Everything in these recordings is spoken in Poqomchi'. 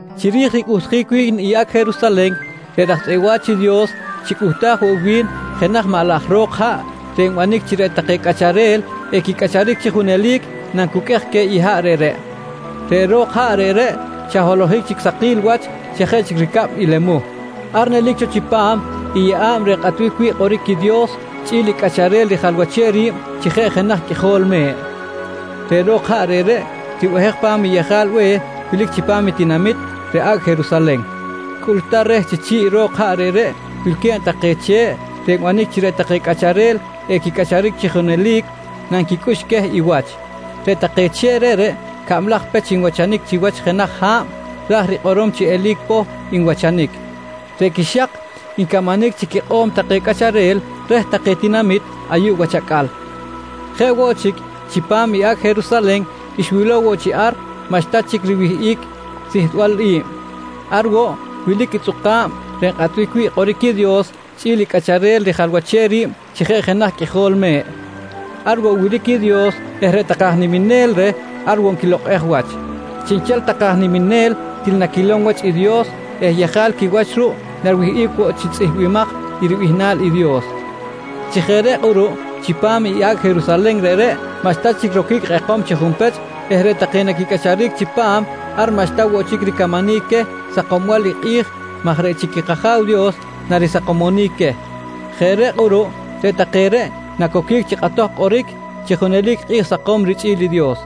Chiri̱j ricꞌuhtjic wi̱n i “Acꞌ Jerusalen”, reꞌ raj tzꞌeꞌ wa̱ch i Dios xicꞌuhtaj woꞌ wi̱n jenaj maꞌ laj ro̱k haꞌ reꞌ nbanic chi reꞌ take cꞌacharel equicꞌacharic chi junelic nancuqꞌuej queh i haꞌ reꞌreꞌ. Reꞌ ro̱k haꞌ reꞌreꞌ xa holohic chic sakil wach xa jeꞌ chic ricab i lemuh. Ar nelic cho chipam i yeꞌa̱b reꞌ nkꞌatbic wi̱ꞌ kꞌoric i Dios chꞌi̱l i Cꞌacharel rijalwachem ri̱b chi jeꞌ jenaj Qꞌuijol Me̱ꞌ. Reꞌ ro̱k haꞌ reꞌreꞌ, ribehej pa̱m i yejal be̱h wilic chipam i tinamit reꞌ “Acꞌ Jerusalen”. Cꞌultar reh chi chi̱ꞌ ro̱k haꞌ reꞌreꞌ wilque̱b take che̱ꞌ reꞌ nbanic chi reꞌ take cꞌacharel equicꞌacharic chi junelic nanquicꞌux queh i wach. Reꞌ take che̱ꞌ reꞌreꞌ cablaj pech nwachanic chiwach jenaj ha̱b, raj rikꞌorom chi eli̱c poh nwachanic. Reꞌ quixak ncamanic chi quikꞌo̱m take cꞌacharel reh take tinamit ayuꞌ wach acꞌal. Jeꞌ woꞌ chic, chipam i “Acꞌ Jerusalen” xwilow woꞌ chi ar maꞌxta chic riwihꞌic sihtbal i̱b. Ar woꞌ wilic i tzꞌuka̱b reꞌ nkꞌatbic wi̱ꞌ kꞌoric i Dios chꞌi̱l i Cꞌacharel rijalwachem ri̱b chi jeꞌ jenaj Qꞌuijol Me̱ꞌ. Ar woꞌ wilic i Dios eh reꞌ take aj niminel reh ar woꞌ nquilokꞌej wach. Chiꞌnchel take aj niminel til naquilom wach i Dios eh yejal quiwach ruꞌ nariwihꞌic woꞌ chi tzꞌihmbimaj i ribihnal Dios. Chi jeꞌ reꞌ kꞌuruꞌ chipam i “Acꞌ Jerusalen” reꞌreꞌ maꞌxta chic roquic kꞌekom chi junpech eh reꞌ take naquicꞌacharic chipam ar maꞌxta woꞌ chic ricamanic queh sakombal i kꞌi̱j maj reꞌ chic i kAja̱w Dios narisakomonic queh. Jeꞌ reꞌ kꞌuruꞌ reꞌ take reꞌ nacoquic chi kꞌatoj kꞌoric chi junelic kꞌi̱j sakom richꞌi̱l i Dios.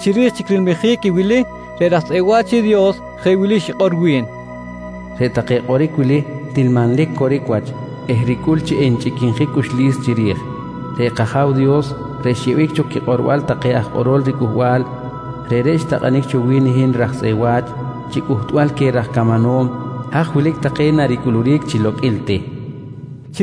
Chiri̱j chic rilmijic i wili, reꞌ raj tzꞌeꞌ wa̱ch i Dios jeꞌ wili xikꞌor wi̱n: «Reꞌ take kꞌoric wili til manlic coric wach eh ricꞌul chi enchꞌiquinjic cꞌuxlis chiri̱j. Reꞌ kAja̱w Dios reꞌ xyeꞌbic cho quikꞌorbal take aj kꞌorol riCꞌuhbal, reꞌreꞌ xtakꞌanic cho wi̱n i hin raj tzꞌeꞌ wa̱ch chi cꞌuhtbal queh raj camanom haj wilic take naricꞌuluric chi loqꞌuil ti, nqui xikꞌor wi̱n.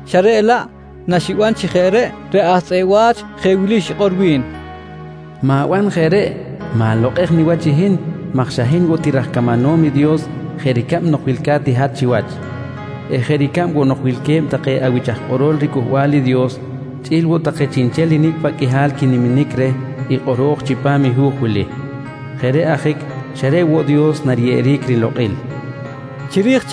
xa reꞌ laꞌ naxniban chi jeꞌ reꞌ, reꞌ aj tzꞌeꞌ wa̱ch jeꞌ wili xikꞌor wi̱n: «Ma̱ban jeꞌ reꞌ! Ma̱lokꞌej niwach i hin maj xa hin woꞌ ti raj camanom i Dios jeꞌ ricab nok wilca̱t i hat chiwach eh jeꞌ ricab woꞌ nok wilque̱b take awich aj kꞌorol riCꞌuhbal i Dios chꞌi̱l woꞌ take chiꞌnchel i nicꞌ paꞌ qꞌuihal quiniminic reh i kꞌoro̱j chipam i hu̱j wili. Jeꞌ reꞌ ajic, xa reꞌ woꞌ Dios nariyeꞌeric rilokꞌil, nqui xikꞌor wi̱n.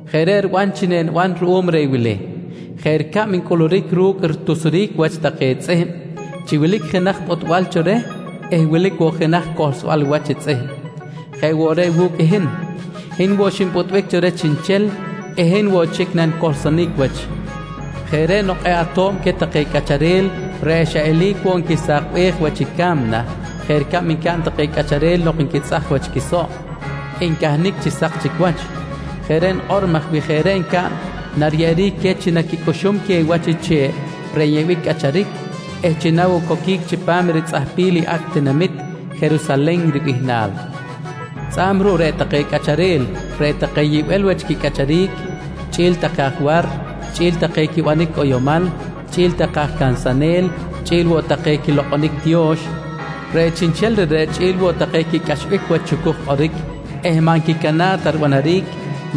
Jeꞌ reꞌ riban chi eniban ruꞌum reh i wili: Jeꞌ ricab ncꞌuluric ru̱cꞌ ritusjic wach take tzꞌihm chi wilic jenaj pꞌutbal cho reh eh wilic woꞌ jenaj cohlsbal wach tzꞌihm, jeꞌ woꞌ reꞌ wu̱cꞌ i hin, hin woꞌ xinpꞌutbic cho reh chiꞌnchel eh hin woꞌ chic nanicohlsonic wach. Jeꞌ reꞌ nok kꞌe̱ꞌ ato̱b queh take cꞌacharel reꞌ xa eli̱c woꞌ nquisakbej wach i ca̱mna jeꞌ ricab ncaꞌn take cꞌacharel nok nquitzꞌaj wach i quisoꞌ ncahnic chi sak chic wach. Jeꞌ reꞌ nikꞌor maj wi jeꞌ reꞌ ncaꞌn nariyeꞌeric queh chi naquicꞌuxum queh i wach i che̱ꞌ reꞌ nyeꞌbic cꞌacharic eh chi na woꞌ coquic chipam ritzꞌahpil i “Acꞌ tinamit Jerusalen” ribihnal. Tzꞌa̱b ruꞌ reꞌ take cꞌacharel reꞌ take yibel wach quicꞌacharic, chꞌi̱l take aj war, chꞌi̱l take quibanic cꞌoyomal, chꞌi̱l take aj cansanel, chꞌi̱l woꞌ take quilokꞌonic tiyo̱x, reꞌ chiꞌnchel reꞌreꞌ chꞌi̱l woꞌ take quicꞌaxbic wach i chucuj kꞌoric eh maꞌ nquicana̱ꞌ ta ribanaric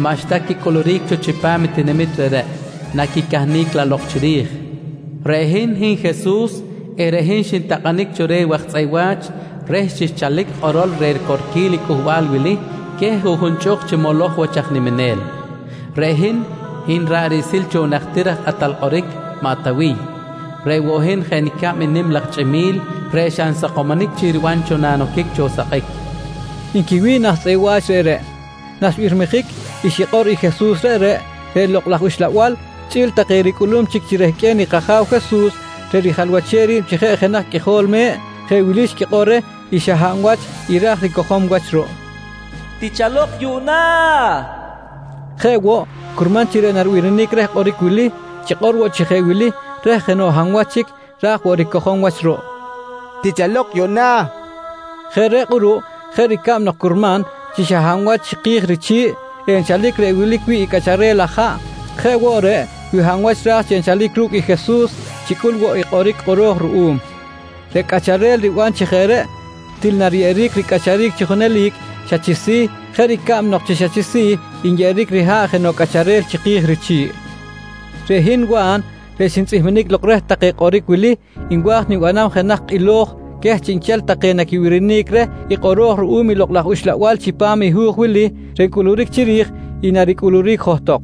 maꞌxta quicꞌuluric cho chipam tinamit reꞌreꞌ, naquicahnic laꞌ lok chiri̱j. ‹Reꞌ hin, hin Jesus eh reꞌ hin xintakꞌanic cho reh waj tzꞌeꞌ wa̱ch reh chi xchalic kꞌorol reh ricorquil i cꞌuhbal wili queh i juꞌjun chꞌuk chi moloj wach aj niminel. Reꞌ hin, hin ra̱ꞌ riꞌsil cho i najtir aj kꞌatal kꞌoric maꞌ Tawiy. Reꞌ woꞌ hin jeꞌ nicab i nim laj chꞌimi̱l reꞌ xa nsakomonic chic riban cho nanoquic cho sakꞌic, nqui Jesus, nqui wi̱n i aj tzꞌeꞌ wach reꞌreꞌ. Naxbirmijic i xikꞌor i Jesus reꞌreꞌ, reꞌ Lokꞌ laj Uxlabal chꞌi̱l take ricꞌulum chic chi rehqꞌue̱n i kAja̱w Jesus reꞌ rijalwachem ri̱b chi jeꞌ jenaj Qꞌuijol Me̱ꞌ, jeꞌ wili xquikꞌor reh i xa hab wach i ra̱j ricojom wach ruꞌ: «Tichalok yuꞌna! nqui take. Jeꞌ woꞌ, curman chi reꞌ naribirinic reh kꞌoric wili, chikꞌor woꞌ chi jeꞌ wili reh jenoꞌ hab wach chic ra̱j woꞌ ricojom wach ruꞌ: «Tichalok yuꞌna! nqui chikꞌor. Jeꞌ reꞌ kꞌuruꞌ jeꞌ ricab nok curman chi xa hab wach chiki̱j richi̱ꞌ nchalic reꞌ wilic wi̱ꞌ i cꞌaꞌchel laj haꞌ, jeꞌ woꞌ reꞌ wi hab wach ra̱j chi enchal ru̱cꞌ i Jesus chicꞌul woꞌ i kꞌoric kꞌoro̱j ruꞌum. Reꞌ cꞌacharel riban chi jeꞌ reꞌ til nariyeꞌeric ricꞌacharic chi junelic xa chi si̱ jeꞌ ricab nok chi xa chi si̱ nyeꞌeric riha̱ꞌ jenoꞌ cꞌacharel chiki̱j richi̱ꞌ. Reꞌ hin Wa̱n reꞌ xintzꞌihminic lok reh take kꞌoric wili nwa̱j nibanam jenaj kꞌilo̱j queh chiꞌnchel take naquibirinic reh i kꞌoro̱j ruꞌum i Lokꞌ laj Uxlabal chipam i hu̱j wili reꞌ nkꞌoric chiri̱j i naricꞌuluric johtok.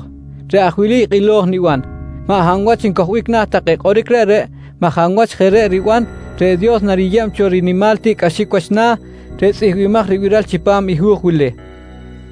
Reꞌ aj wili i kꞌilo̱j niban: Maꞌ hab wach ncojbic na̱ take kꞌoric reꞌreꞌ maj hab wach jeꞌ reꞌ riban, reꞌ Dios nariyeb cho rinimal tiꞌcꞌaxic wach na̱ reꞌ tzꞌihmbimaj ribiral chipam i hu̱j wili.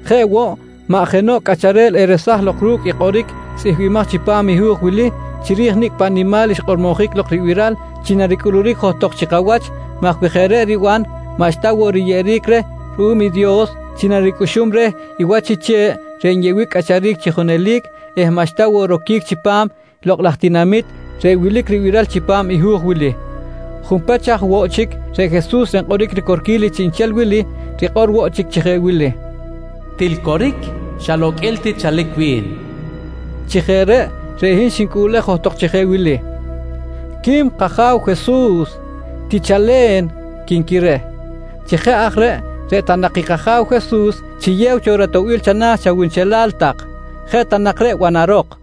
Jeꞌ woꞌ, maꞌ jenoꞌ cꞌacharel eresaj lok ru̱cꞌ i kꞌoric tzꞌihmbimaj chipam i hu̱j wili chiri̱j nicꞌ paꞌ nimal xkꞌormojic lok ribiral chi naricꞌuluric johtok chi kawach maj wi jeꞌ reꞌ eriban maꞌxta woꞌ riyeꞌeric reh ruꞌum Dios chi naricꞌuxum reh i wach i che̱ꞌ reꞌ nyeꞌbic cꞌacharic chi junelic eh maꞌxta woꞌ roquic chipam “Lokꞌ laj Tinamit” reꞌ wilic ribiral chipam i hu̱j wili. Junpech aj woꞌ chic, reꞌ Jesus reꞌ nkꞌoric ricorquil i chiꞌnchel wili, rikꞌor woꞌ chic chi jeꞌ wili: «Til coric, xa loqꞌuil ti chalic wi̱n, nqui rikꞌor. Chi jeꞌ reꞌ, reꞌ hin xnicꞌuꞌlej johtok chi jeꞌ wili: «Quim kAja̱w Jesus. Tichalen! quinqui reh. Chi jeꞌ aj reꞌ, reꞌ ta nak i kAja̱w Jesus chiyew cho ratoꞌbil chana̱ chawunchelal tak. Jeꞌ ta nak reꞌ banarok!